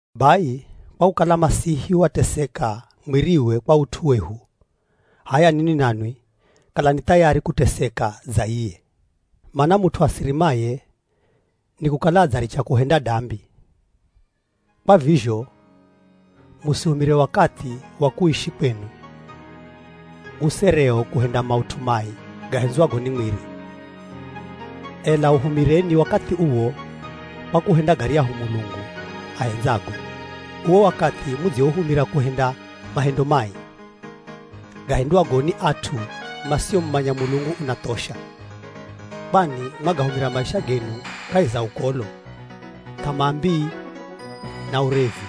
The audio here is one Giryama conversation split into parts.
Bai kwa kukala Masihi wateseka mwiriwe kwa ut'u wehu, h'aya ninwi nanwi kalani thayari kuteseka dza iye. Mana mut'u asirimaye ni kukala adzaricha kuhenda dambi. Kwa vizho, musihumire wakathi wa kuishi kwenu usereo, kuhenda maut'u mai gahendzwago ni mwiri, ela uhumireni wakathi uwo kwa kuhenda garyahu Mulungu ahendzago. Uwo wakathi mudziouhumira kuhenda mahendo mai, gahendwago ni at'u masiomumanya Mulungu unathosha, kwani mwagahumira maisha genu kahi za ukolo, th'amaa mbii, na urevi,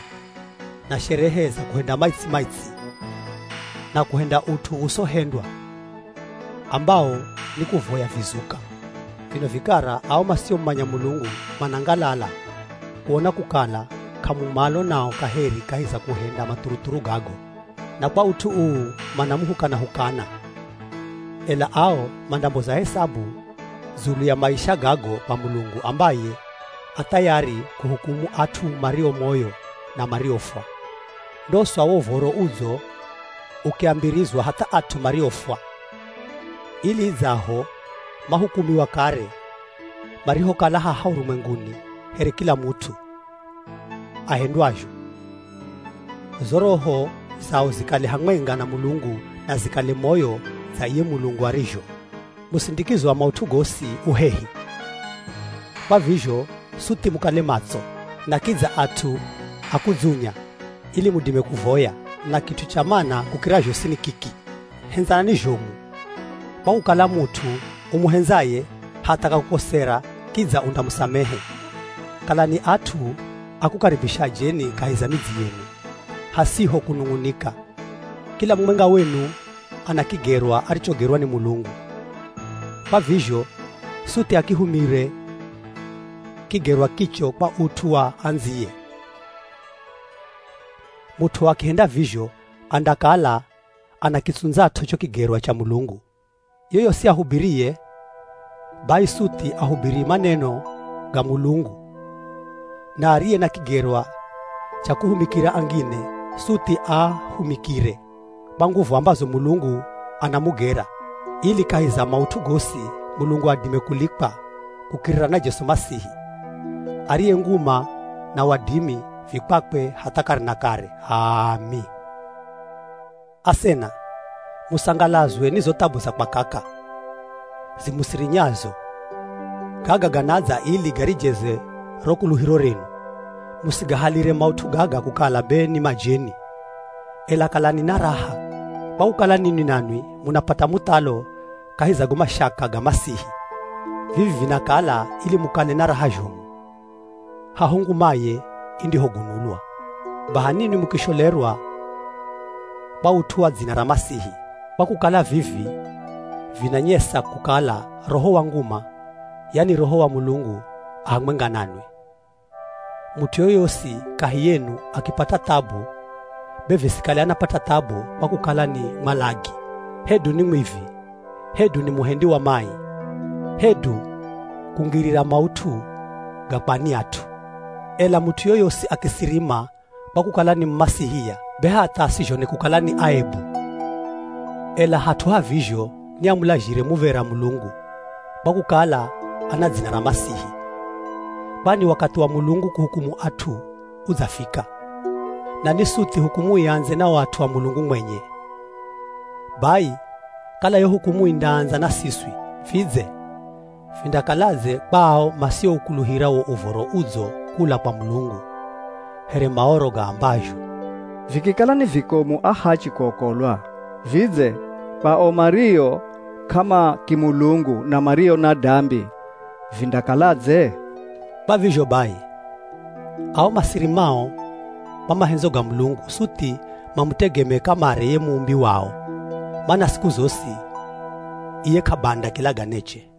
na sherehe za kuhenda maitsi-maitsi, na kuhenda ut'u usohendwa ambawo ni kuvoya vizuka. Vino vikara ao masiomumanya Mulungu, manangalala kuona kukala k'amu malo nao kaheri kahi za kuhenda mathuruthuru gago, na kwa ut'u uu manamuhukana-hukana. Ela ao mandamboza hesabu dzulu ya maisha gago kwa Mulungu ambaye a thayari kuhukumu at'u mario moyo na mariofwa. Ndosa wo Uv̱oro Udzo ukiambirizwa hatha at'u mariofwa, ili idzaho mahukumiwa kare marihokala haha urumwenguni here kila mut'u ahendwazho, zo roho zao zikale hamwenga na Mulungu na zikale moyo dza iye Mulungu arizho. Musindikizo wa maut'u gosi u hehi, kwa vizho suthi mukale matso na kidza at'u a kudzunya ili mudime kuvoya. Na kit'u cha mana kukira zhosi ni kiki, hendzanani zhomu, kwa kukala mut'u umuhendzaye hatha akakukosera kidza undamusamehe. Kalani at'u a kukaribisha ajeni kahi za midzi yenu, hasiho kunung'unika. Kila mumwenga wenu ana kigerwa arichogerwa ni Mulungu, kwa vizho suthi akihumire kigerwa kicho kwa ut'u wa andziye, mut'u akihenda vizho andakala anakitsundzat'o cho kigerwa cha Mulungu. Yoyosi ahubiriye bai suthi ahubiri maneno ga Mulungu, na ariye na kigerwa cha kuhumikira angine, suthi aahumikire kwa nguvu ambazo Mulungu anamugera, ili kahi za maut'u gosi, Mulungu adime kulikwa kukirira na Jesu Masihi, ariye nguma na wadimi vi kwakwe hatha kare na kare. H'aami! Asena, musangalazwe ni zo thabu za kwakaka zimusirinyazo. Gaga ganadza ili garijeze ro kuluhiro renu. Musigahalire maut'u gaga kukala be ni majeni. Ela kalani na raha kwa kukala ninwi nanwi munapata muthalo kahi za go mashaka ga Masihi; Vivi vinakala ili mukale na raha zhomu, haho ngumaye indihogunulwa. Baha ninwi mukisholerwa kwa ut'u wa dzina ra Masihi, kwa kukala vivi vinanyesa kukala Roho wa nguma, yani Roho wa Mulungu a hamwenga nanwi. Mut'u yoyosi kahi yenu akipata thabu be visikale anapata thabu kwa kukala ni mwalagi, hedu ni mwivi, hedu ni muhendi wa mai, hedu kungirira maut'u ga kwa ani at'u. Ela mut'u yoyosi akisirima kwa kukala ni Mumasihia, be hatha asizhone kukala ni aebu, ela hat'u ha vizho ni amulazhire muv̱era Mulungu kwa kukala ana dzina ra Masihi. Kwani wakathi wa Mulungu kuhukumu at'u udzafika, na ni suthi hukumu iandze na o at'u a Mulungu mwenye. Bai kala yo hukumu indaandza na siswi, vidze vindakaladze kwa ao masioukuluhira wo Uv̱oro Udzo kula kwa Mulungu? Here Maoro gaambazho, “Vikikala ni vikomu ahachi kuokolwa, vidze kwa o mario k'amakimulungu na mario na dambi vindakaladze?” Kwa vizho bai, ao masirimao kwa mahendzo ga Mulungu suthi mamutegemee kamare ye muumbi wao, mana siku zosi iye k'abanda kilaganeche.